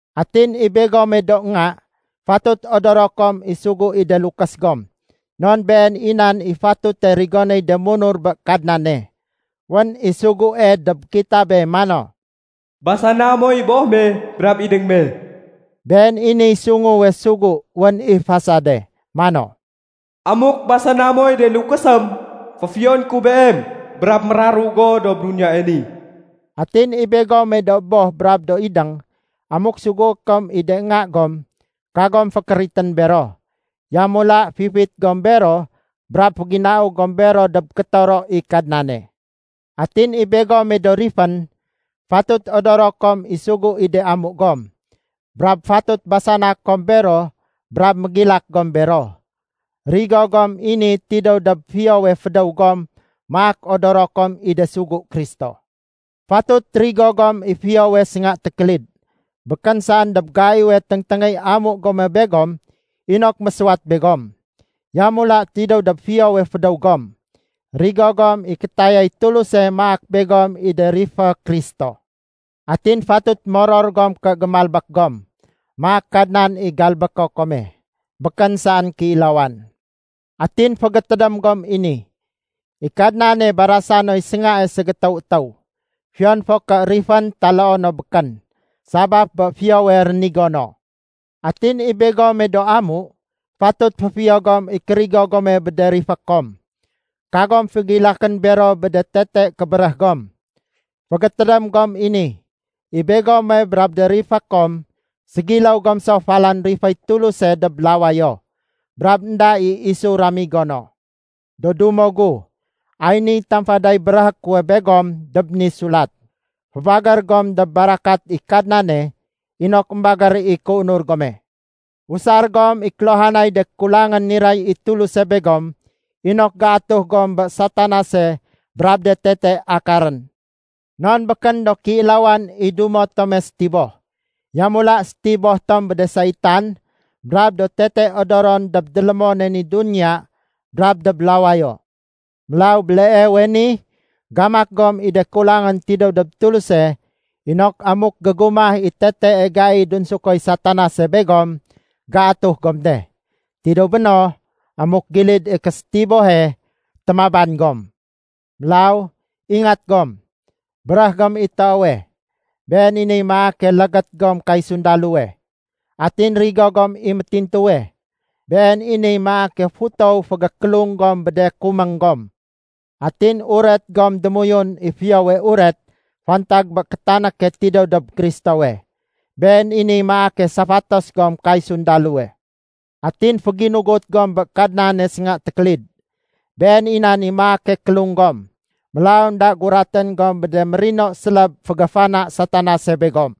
Atin i begome do nga, fatut odoro kom i sugu i de lukés gom, non been i nan i fatute rigonéy de munur bé Kadnane. Wén i sugue dob kitabe mano, “Basana moy boh me brab idéng me.” Been i niy sunguwe sugu wén i fasade, mano, “Amuk basana moy de lukésém, féfiyoné ku beem brab méraru go dob duniyae ni.” Atin i begome do boh brab do idéng, amuk sugué kom i de nga gom, kagom fékéritén bero. Yamula fifit gom bero brab féginau gom bero dob kétoro i Kadnane. Atin i begome do rifén, fatut odoro kom i sugu i de amu gom, brab fatut basana kom bero brab mégilak gom bero. Rigo gom i ni tidéw dob fiyowe fédéw gom maak odoro kom i de sugu Kristo. Fatut rigo gom i fiyowe sénga tékélid, békén saén dob gaiwe téngténgéy amu gome begom inok mésuwat begom. Yamula tidéw dob fiyowe fédéw gom, rigo gom i kétayay Tuluse maak begom i de rifé Kristo. Atin fatut moror gom ké gémalbék gom, maak Kadnan i galbéko kome, békén saén kéilawan. Atin fégétédém gom i ni, i Kadnane barasa noy séngae ségétéw étéw, fiyon fo ké rifén taloo no békén, sabaf bé fiyowe rénigo no. Atin i begome do amu, fatut féfiyo gom i kérigo gome bé de rifé kom. Kagom fégilakén bero bé de tete kébéréh gom. Fégétédém gom i ni, i begome brab de rifé kom ségiléw gom so falan riféy Tuluse dob lawayo, brab énda i isu ramigo no. Do dumo gu, ay niy tamfaday béréhé kuwe begom dob ni sulat. Fébagér gom dob barakat i Kadnane inok émbagér i kéunur gome. Usar gom i kéluhanay de kulangén niray i Tuluse begom inok géatuh gom bé Satanase brab de tete akarén. Non békén do kéilawan i dumo tome sétiboh. Yamula sétiboh tom bé de saitan brab do tete odoron dob délémone ni duniya brab dob lawayo. Mélaw béleewe ni gamak gom i de kulangén tidéw dob Tuluse inok amuk gégumah i tetee gai dunsukoy Satanase begom, géatuh gom de. Tidéw béno, amuk gilid i késétibohe, témaban gom. Mélaw ingat gom. Béréh gom i toowe. Been i niy maake légét gom kay sundalowe. Atin rigo gom i métintuwe. Been i niy maake futow fégékélung gom bé de kuméng gom. Atin uret gom démoyun i Fiyowe Uret fantag bé kétanéke tidéw dob Kristowe. Been i niy maake safatos gom kay sundalowe. Atin féginugut gom bé Kadnane sénga tékélid. Been i nan i maake kélung gom. Mélaw énda guratén gom bé de mérino séléb fégéfana Satanase begom.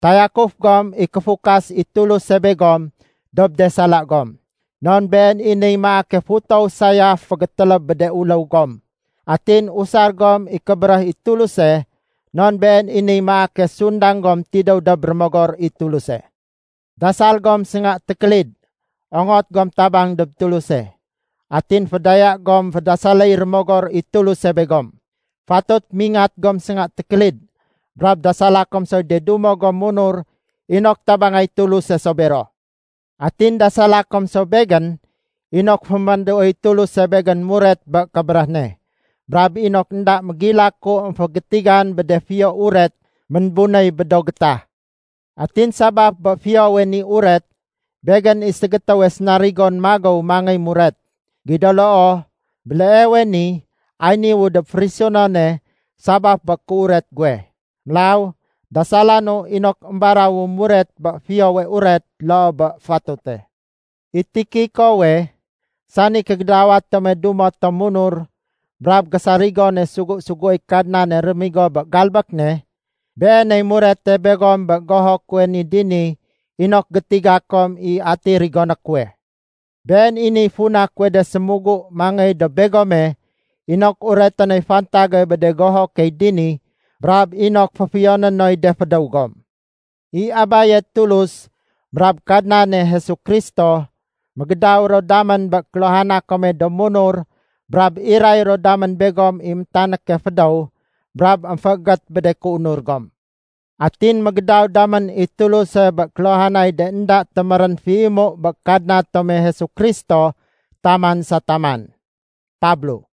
Tayakuf gom i kéfukas i Tuluse begom dob de sala gom. Non been i niy maake futow sayaf fégétéléb bé de uléw gom. Atin usar gom i kébéréh i Tuluse, non been i niy maake sundang gom tidéw dob Rémogor i Tuluse. Dasal gom sénga tékélid ongot gom tabang dob Tuluse. Atin fédaya gom fédasaléy Rémogor i Tuluse begom. Fatut mingat gom sénga tékélid brab dasala kom soy de dumo gom munur inok tabangay Tuluse so bero. Atin dasala kom so begén inok fémanduoy Tuluse begén muret bé kébéréh ne, brab inok énda mégilaku émfégétigan bé de Fiyo Uret ménbunéy bé do gétah. Atin sabaf bé Fiyowe ni Uret, begén i ségétéwe sénarigon magéw mangéy muret. Gido loo, béleewe ni ay niwu dob férisunone sabaf bé kéuret guwe. Mélaw dasalanu inok émbarawu muret bé Fiyowe Uret loo bé fatute. I Tikikowe, sani kégédawa tome dumo tom munur brab gésarigone sugu-suguéy Kadnane rémigo bé galbék ne, beeney murete begom bé goho kuwe ni dini inok gétiga kom i ati rigoné kuwe. Been i niy funa kuwe de sémugu mangéy dob begome inok ureté noy fantage bé de goho key dini brab inok féfiyoné noy de fédéw gom. I Abaye Tulus brab Kadnane Jesu Kristo, mégédaw ro damén bé kéluhana kome do munur brab iray ro damén begom i métanéke fédéw brab émféégét bé de kéunur gom. Atin mégédaw damén i Tuluse bé kéluhanay de énda témérén féimu bé Kadna tome Jesu Kristo taman sa taman. Pablo